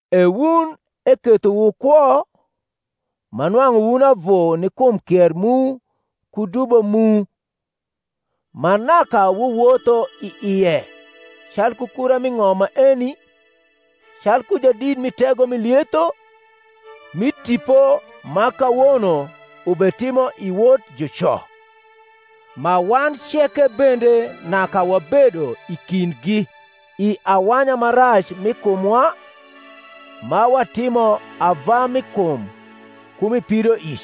E wun eketho wukwo, ma nwang’u wun avu ni kum kier mu ku dubo mu, ma naka wuwotho i ie calku kura mi ng’om maeni, calku jadit mi tego mi lietho, mi tipo ma kawono ubetimo i wot juco; ma wan ceke bende naka wabedo i kindgi i awanya ma rac mi kumwa, ma watimo ava mi kum ku mi pidoic,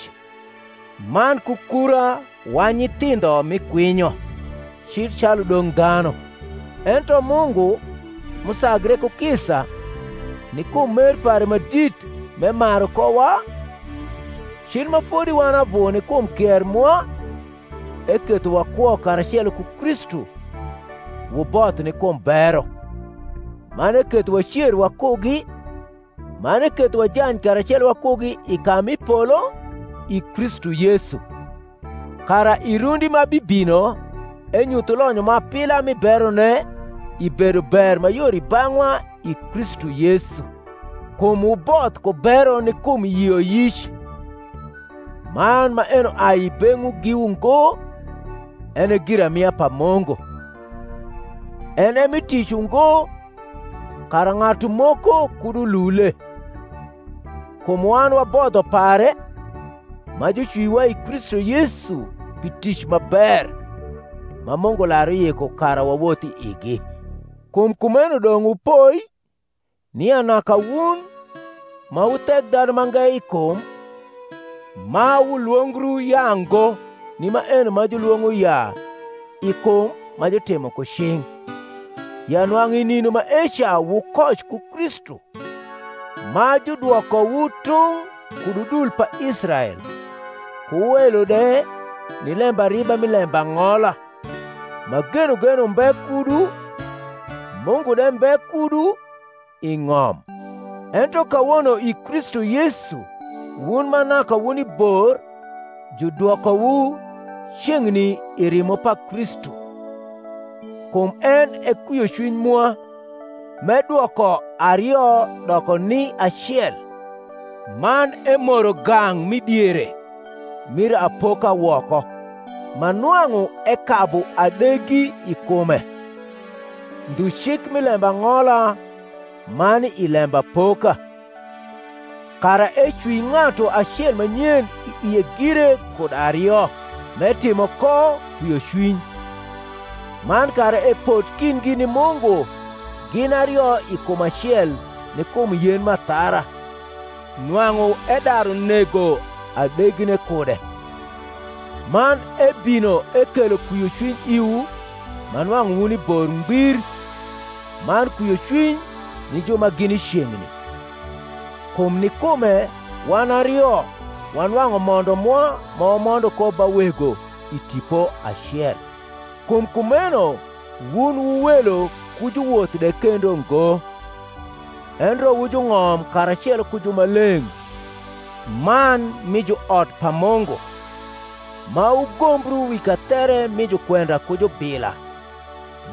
man ku kura wa nyithindho mi kwinyo, cil calu dong’ dhanu: ento Mungu, m’usagre ku kisa, ni kum mer pare ma dit m’emaru kowa, cil ma fodi wan avu ni kum kier mwa, eketho wakwo karacelo ku Kristu (wuboth ni kum bero), man eketho wacer wakugi, man eketho wajany karacelo wakugi i ka mi polo, i Kristu Yesu: kara i rundi ma bibino enyuth lonyo ma apila mi berone i bedober ma yor i bang’wa i Kristu Yesu: kum wuboth ku bero ni kum yioyic; man maeno ai i beng’wu giwu ngo, en e giramia pa Mungu; en e mi tic ungo, kara ng’atu moko kud ulule. Kum wan wa bodho pare, ma jucwiowa i Kristu Yesu pi tic ma ber, ma Mungu lar uyiko kara wawoth i igi. Kum kumeno dong’ wupoi, nia naka wun, ma wu Thekdhanumange i kum, ma wulwongru Yaango ni maeno ma juiwong’o Yaa, i kum, ma jutimo ku cing’. ya nwang’u i nindo maeca wukoc ku Kristu, ma judwokowu tung’ kud udui pa Israel, ku welo de ni lembariba mi lembang’ola, ma genogen umbe kudu, Mungu de mbe kudu, i ng’om. Ento kawono i Kristu Yesu wun ma naka wuni bor judwokowu ceng’ni i rimo pa Kristu. Kum en e kwiocwiny mwa, m’edwoko ario doko ni acel, man emoro gang’ m’i diere mir apoka woko, ma nwang’u ekabu adegi i kume, ndhu cik mi lembang’ola ma ni i lembapoka; kara ecwi ng’atu acel ma nyen i ie gire kud ario, m’etimo ko kwiocwiny; man kara epot kindgi ni Mungu gin ario i kum acel ni kum yen m’athara, nwang’u edaru nego adegine kude: man ebino ekelo kwiocwiny iwu ma nwang’u wuni bor ngbir, man kwiocwiny ni ju ma gini ceng’ni: kum ni kume wan ario wanwang’u mondo mwa ma wamondo ko ba Wego i Tipo acel. Kum kumeno wun wu welo ku juwoth de kendo ngo, endre wu jung’om karacelo ku jumaleng’ man mi j uot pa Mungu, ma wugombru wi kathere mi jukwenda ku jubila,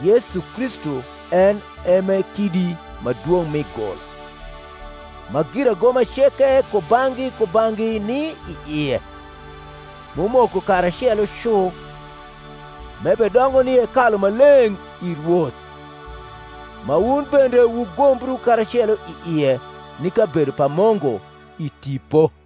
Yesu Kristu en e m’e kidi ma dwong’ mi gul; ma giragoma ceke kubang’gi kubang’gi ni i ie, m’umoko karacelo cu, m’ebedongo ni hekalu ma leng’ i Rwoth; ma wun bende wugombru karacelo i ie ni kabedo pa Mungu i Tipo.